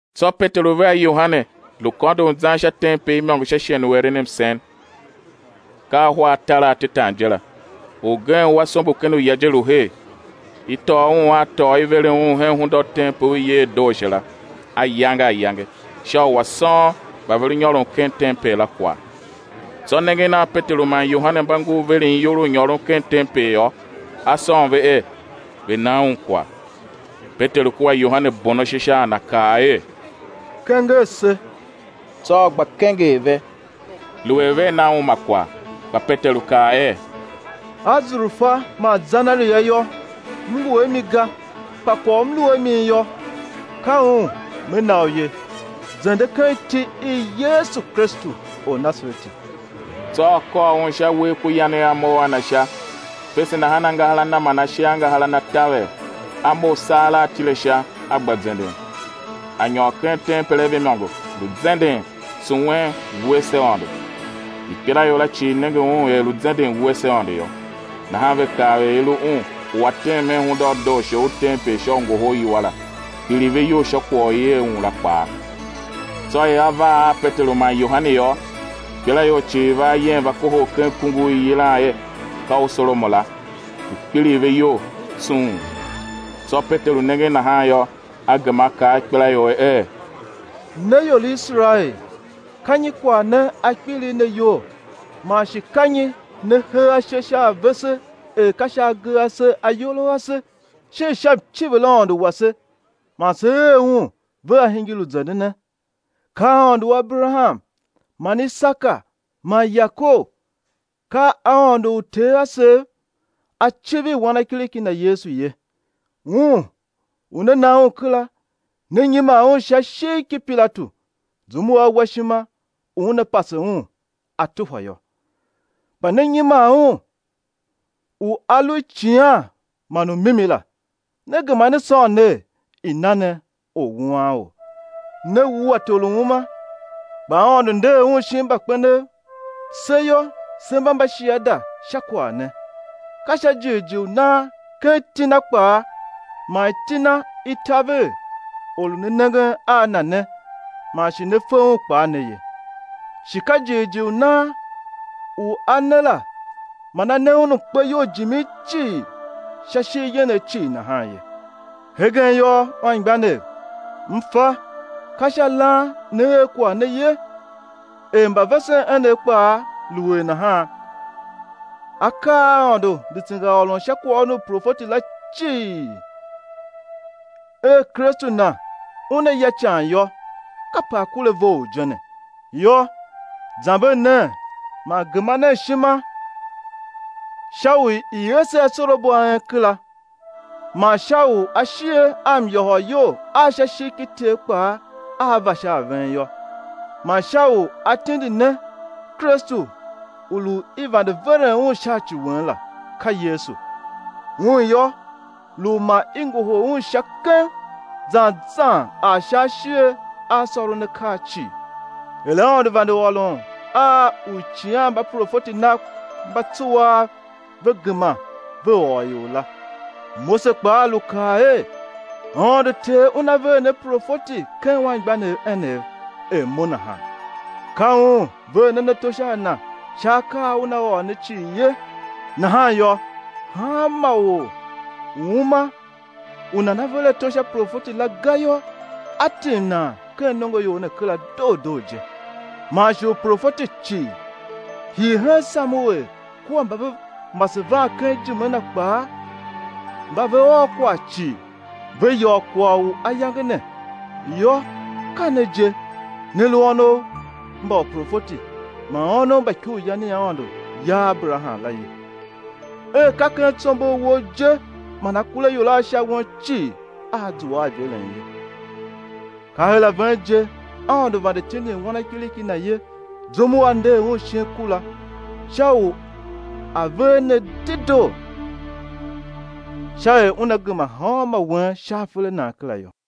Tsô Peteru vea Yohane lu kôndon zan sha tempel imôngo sha shighe u eren msen, ka ahwa atar atetan je la. Orgen u a sombo ken uya je lu her, i tôô un a tôô i veren un hen hunda u tempel u i yer er dooashe la, ayange ayange, sha u a̱ sôn mba ve lu nyôron ken tempel la kwagh. Tsô nengen a Peteru man Yohane mba ngur veren iyol u nyôron ken tempel yô, a sôn ve er, ve̱ na un kwagh. Peteru kua Yohane bon ashe sha a na kaa er: Kenger se. Tsô a gba kenger ve, lu er vea na un ma kwagh. Kpa Peteru kaa er: Azurfa man zenaria yô, m ngu a mi ga, kpa kwagh u m lu a mi yô, ka un me na u ye; zende ken iti i Yesu Kristu Ornasareti. Tsô a kôr un sha uwegh ku yanegh a mough a na sha, fese nahan angahar a na man ashe a angahar a na taver, a mough saghera a tile sha, a gba zenden; a nyôr ken tempel a ve imôngo, lu zenden, tsuwen, wuese Aôndo. Ikpelaior la cii nenge un er lu zenden, wuese Aôndo yô, nahan ve kav er i lu un u a tem hen Hunda u Dooashe u tempel sha u ngohol iwua la; kpiligh ve iyol sha kwagh u i er un la kpaa. Tsô er a var a Peteru man Yohane yô, ikpelaior cii va ayem va kohol ken kungur u i yilan er ka u Solomon la, lu kpiligh ve iyol tsung. Tsô Peteru nengen nahan yô, a gema a kaa a ikpelaior er: Ne ior i Iserael, ka nyi kwagh ne a kpiligh ne iyol, man shi ka nyi ne hee ashe sha a vese er ka sha agee a ase ayol a ase, shin sha mciviraôndo wase man se er un ve a hingir u zendene? Ka Aôndo u Aberaham man Isaka man Yakob, ka Aôndo u uter asev, A civir Wanakiriki Na Yesu ye, Un u ne na Un kera, ne nyiman Un sha ishigh ki Pilatu zum u wa ishima u una pase Un á tuhwa yô. Kpa ne nyiman Un u a lu Icighan man u Mimi la, ne gema ne sôn ner, i̱ na ne orwuanor. Ne wua Tor u uma, kpa Aôndo nder Un shin mbakpenev; se yô, se mba mbashiada sha kwagh ne. Ka sha jighjigh u nan ken iti Na kpaa, man iti Na i taver or u ne nengen a na ne, man shi ne fe un kpaa ne ye; shi ka jighjigh u nan u a ne la, man a ne un mkpeyol jimin cii sha ishigh yenegh cii nahan ye. Hegen yô, anmgbianev, m fa, ka sha lan ne er kwagh ne ye, er mbavesen enev kpaa lu er nahan. Akaa a Aôndo lu tsengaôron sha kwaghôron u profeti la cii er, Kristu Na Una ya ican yô, kape A kure a vough je ne. Yô, zamber nen man gema nen ishima, sha u i̱ ese asorabo a en kera, man sha u ashighe a myôhôryol a sha ishigh ki Ter kpaa a̱ va sha a ven yô; man sha u A̱ tindi ne Kristu u lu i vande veren Un sha ci wen la ka Yesu. Un yô, lu u ma i ngohol Un Sha keng, zan zan ar sha ashighe a sôron akaa cii, er Aôndo vande ôron a uicighanmbaprofeti Nav mba tsuaa, ve gema ve ôr ior la. Mose kpaa lu kaa er: Aôndo Ter Una ver ne profeti ken anmgbianev enev, er mo nahan; ka Un ver nen ato sha a Na sha akaa a Una ôr ne cii ye. Nahan yô, hanma or u uma u nana ver ato sha Profeti la ga yô, á tim nan ken nongoior ne kera doo doo je. Man shi uprofeti cii, hii hen Samuel kua mba ve mase van ken ijime na kpaa, mba ve ôr kwagh cii, ve yôô kwagh u ayange ne. Yô, ka ne je, ne lu ônov mba uprofeti man ônov mba ikuryan i Aôndo ya a Aberaham la ye, er: Ka ken tsombor wou je man akuraior a sha won cii aa zua a iveren ye. Ka her a ven je Aôndo vande tindin Wanakiriki Na ye zum u A nder Un shin ku la, sha u A̱ ver ne dedoo, ka er Una gema hanmô wen sha afer a nan kera yô.